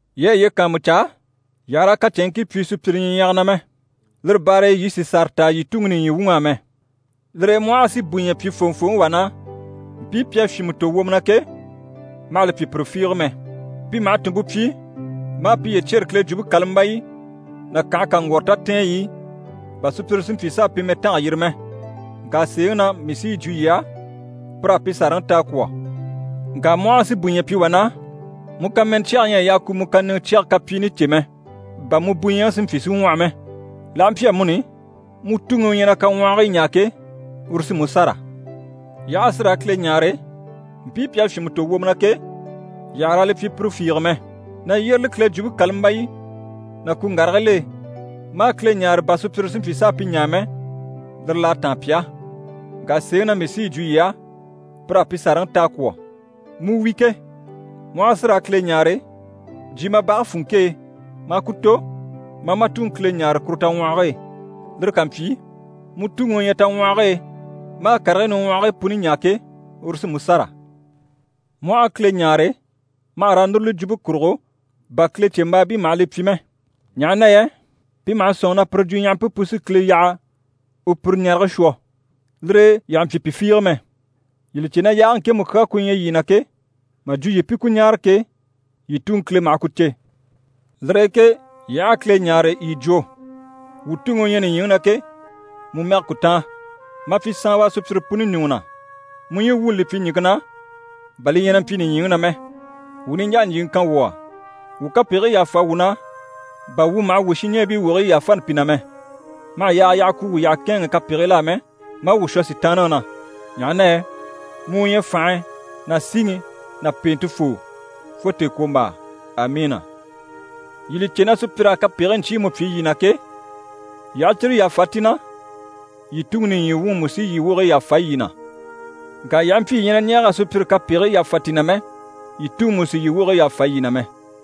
Yii a yiye kàanmucaa, yii àha raa kacɛnŋkii pyi sùpyire ɲyiɲyage na mɛ. Lire baare e yii sì sàra ta yii Tuŋi nìɲyi wuŋ'á mɛ. Lire e mu aha a si bùɲyɛ pyi fòŋɔfooŋi wà na, mpii pi à fyìnmɛ tò wwomɔ na ke, ma hà li pyi pire fiige mɛ. Pi maha tùnmpe pyi maa piye cyêre Kile Jwumpe kàlambayi ná kànhe kaŋgwɔrɔ tatɛɛnyi i, bà sùpyire si mpyi s'a pi mɛtange yiri mɛ. Ŋka sèeŋi na mii sí yi jwo yii á, pir'à pi sàraŋi ta a kwɔ̀. Ŋka mu aha si bùɲyɛ pyi wà na, mu kàmɛnɛ cyɛge ɲyɛ a yaa ku mu kàniŋɛ cyɛge kapyiini cè mɛ, bà mu bùɲyɛŋi si mpyi si ŋwɔhɔ mɛ. L'aha mpyi amuni, mu Tuŋi u ɲyɛ na kaŋwɔhigii ɲaa ke, uru sí mu sâra. Yii aha a si raa Kile ɲáare, mpii pi à fyìnmɛ tò wwomɔ na ke, yii àha raa li pyi pire fiige mɛ. Na yyéreli Kile Jwumpe kàlambayi ná kuŋgarigil'e maa Kile ɲáare, bà sùpyire si mpyi s'a pi ɲaa mɛ, lire l'à táan pi á. Ŋka sèeŋi na mii sí yi jwo yii á, pir'à pi sàraŋi ta a kwɔ̀. Mu wi ke, mu aha a si raa Kile ɲáare, jyè ma bage funŋke e maa ku tò, maa ma Tuŋi Kile ɲáare kuru taŋwɔhɔge e. Lire ká mpyi, mu Tuŋi u ɲyɛ taŋgwɔhɔge e, maa karigii niŋwɔhigii puni ɲaa ke, uru sí mu sâra. Mu aha a Kile ɲáare, ma hà raa núruli jwumpe kurugo, bà Kilecembaabii maha li pyi mɛ. Ɲaha na yɛ pi maha sɔ̂nŋi na pire jwuɲyahampe pu sí Kile yaha u pire ɲarege shwɔ. Lire e yii àha mpyi pi fiige mɛ. Yii li cè na yaage ŋkemu kyaa ku ɲyɛ yii na ke, mà jwo yii pi ku ɲáare ke, yii Tuŋi Kile maha ku cè. Lire e ke yii aha a Kile ɲáare, yii jwo “Wuu Tuŋi u ɲyɛ nìɲyiŋi na ke, mu mɛge ku táan. Ma pyi saanwa sùpyire puni ɲùŋɔ na. Mu ɲyii wuuni li pyi ɲìŋke na, bà li ɲyɛ na mpyi nìɲyiŋi na mɛ. Wuu niɲjaa ɲjyìŋi kan wuu á. Wuu kapegigii yàfa wuu na, bà wuu maha wuu shinɲɛɛbii wogigii yàfani pi na mɛ. Ma hà yaaga yaha ku wuu yyaha kɛ̂ɛnŋɛ kapegil'á mɛ, maa wuu shwɔ Sitaanniŋi na. [Ɲaha na yɛ mu u ɲyɛ fànhe ná síŋi ná pèentefoo, fo tèekwombaa. Amiina.]” Yii li cè na sùpyir'à kapegigii ɲcyiimu pyi yii na ke, yii aha cyire yàfa ti na, yii Tuŋi nìɲyi wuŋi mú sí yii wogigii yàfa yii na. Ŋka yii aha mpyi yii ɲyɛ na ɲɛɛg'a sùpyire kapegigii yàfa ti na mɛ, yii Tuŋi mú sì yii wogigii yàfa yii na mɛ.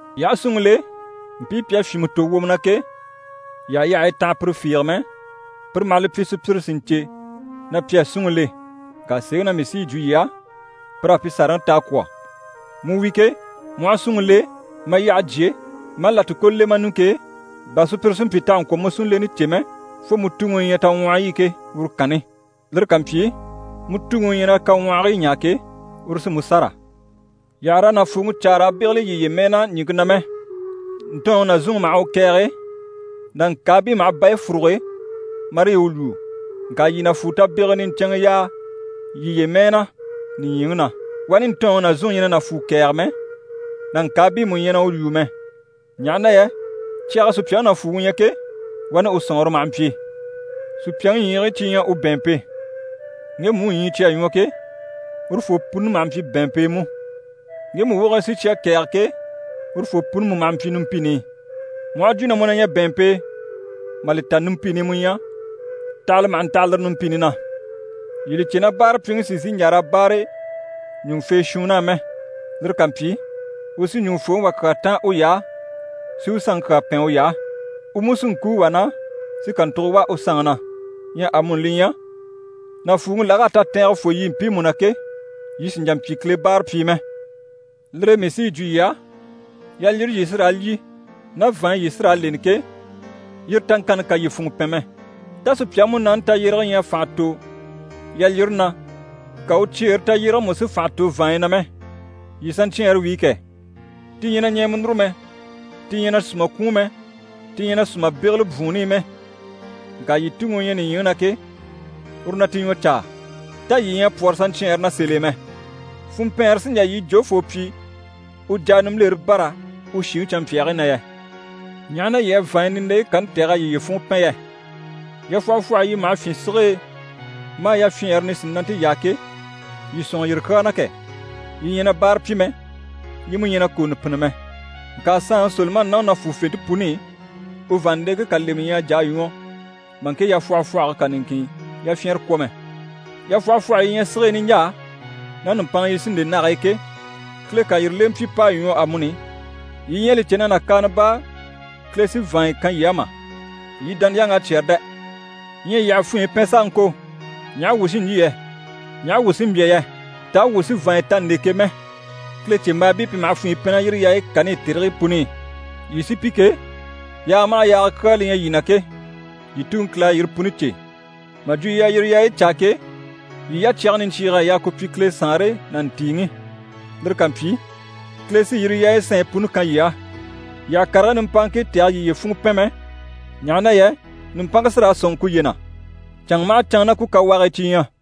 Yii aha súnŋi le, mpii pi à fyìnmɛ tò wwomɔ na ke, yii àha yyahayi tanha pire fiige mɛ, pire maha li pyi sùpyire si ɲcè na pi à súnŋi le. Ŋka sèeŋi na mii sí yi jwo yii á, pir'à pi sàraŋi ta a kwɔ̀. Mu wi ke, mu aha súnŋi le, ma yyahe jyé, maa làtikolo le ma ɲùŋke e, bà sùpyire si mpyi t'àha ŋkwɔ̀ mu súnleni cè mɛ, fo mu Tuŋi u ɲyɛ taŋwɔhɔyi i ke, uru kanni. Lire ká mpyi, mu Tuŋi u ɲyɛ na kaŋwɔhigii ɲaa ke, uru sí mu sâra. Yii àha raa nàfuuŋi caa raa bégeli yiye mɛɛ na ɲìŋke na mɛ. Ntɔɔnŋi ná zúnŋi maha u kɛ̀ɛge, nàŋkaabii maha bayi fúruge marii u lwúu. Ŋka yii nàfuu tabegege niɲcɛnŋɛ yaa yiye mɛɛ na nìɲyiŋi na. Wani ntɔɔnŋi ná zúnŋi ɲyɛ na nàfuu kɛ̀ɛge mɛ, nàŋkaabii mú ɲyɛ na u lwúu mɛ. Ɲaha na yɛ cyage e sùpyaŋi nàfuuŋi ɲyɛ ke, wani u sɔ̀nŋɔre maha mpyi. Sùpyaŋi ɲyiigii cyi ɲyɛ u bɛ̀ɛnmpe. Ŋgemu u ɲyii cyi à ɲwɔ ke, urufoo puni maha mpyi bɛ̀ɛnmpe e mú. Ŋgemu wogigii sí cyi à kɛ̀ɛge ke, urufoo puni mú maha mpyi numpini i. Mu aha jwo na mu na ɲyɛ bɛ̀ɛnmpe e, mà li ta numpini i mu ɲyɛ, tahala maha ntaha lire numpini na! Yii li cè na báarapyiŋi sì n‑sìi n‑jà raa báare ɲùŋufee shuunn'á mɛ. Lire ká mpyi, u sí ɲùŋufooŋi wà kyaa táan uy'á, si u sanŋi kyaa pɛn uy'á. U mú sí n‑kúu wà na, si kàntugo wà u sanŋi na. Ɲyɛ amuni li ɲyɛ, nàfuuŋi lag'à tatɛɛngɛ fô yii mpiimu na ke, yii sì n‑jà n‑pyi Kile báarapyii mɛ. Lire e mii sí yi jwo yii á, yalyire yii sí raa lyî, ná vàanɲyi yii sí raa leni ke, yire taŋkanni kà yii funŋɔ pɛn mɛ. Tá sùpyaŋi múnaani tayyérege ɲyɛ a fànha tò yalyire na, ka u cyeere tayyérege mú si fànha tò vàanɲyi na mɛ? Yii saɲcyɛɛnre wíi kɛ! Ti ɲyɛ na ɲɛɛmɛ núru mɛ, ti ɲyɛ na sùma kwùun mɛ, ti ɲyɛ na sùma bégeli bwùunni i mɛ. Ŋka yii Tuŋi u ɲyɛ nìɲyiŋi na ke, uru na ti ɲwɔ caa. Tá yii ɲyɛ a pwɔ́rɔ saɲcyɛɛnre na sèl'e mɛ? Funmpɛɛnre sí n‑jà yii jofoo pyi u jà a nimbilere bâra u shìŋi canmpyaagii na yɛ? Ɲaha na yii à vàanɲyi nindeyi kani tɛ̀g'a yiye funŋɔ pɛn yɛ? Yafwɔhɔfwɔhɔyi yi maha fyîn sige e maa yafyɛɛnre nisinante yaa ke, yii sɔ̂nŋɔ yire kyaa na kɛ! Yi ɲyɛ na báara pyi mɛ, yi mú ɲyɛ na kòonɔ pînni mɛ. Ŋka saanŋi Solomani ná u nàfuufente puni i, u vàanndeŋke kà lemɛ ɲyɛ a jà a ɲwɔ mà ŋke yafwɔhɔfwɔhɔge kà niŋkin yafyɛnrɛ kwɔ̀ mɛ. Yafwɔhɔfwɔhɔyi yi ɲyɛ sige e niɲjaa, ná nùmpanŋa yi sí n‑le nage e ke, Kile ká yire lemɛ pyi p'à ɲwɔ amuni, yii ɲyɛ a li cè na nàkaana baa Kile sí vàanya kan yii á mà? Yii dániyaŋ'à cyɛ́rɛ dɛ! Ɲyɛ yii àha funɲyi pɛn s'a ŋko “Ɲaha wuu sí n‑lyî yɛ? Ɲaha wuu sí n‑bya yɛ? Taa wuu sí vàanya ta n‑le ke?” mɛ. Kilecembaabii pi maha funɲyi pɛn ná yire yaayi kani i tèrigii puni i. Yii sí pi ke, yaaga maha yaaga kyaa li ɲyɛ yii na ke, yii Tuŋi Kile à yire puni cè. Mà jwo yii a yire yaayi caa ke, yii yacyage niɲcyiig'à yaa ku pyi Kile Saanre ná ntìiŋi. Lire ká mpyi, Kile sí yire yaayi sanɲyi puni kan yii á. Yii àha karigii nimpaaŋkii tɛ̀gɛ yiye funŋɔ pɛn mɛ, ɲaha na yɛ nùmpanŋke sí raa sɔ̂nŋi kuye na. Canŋa maha canŋa ná ku kawaagii cyi ɲyɛ.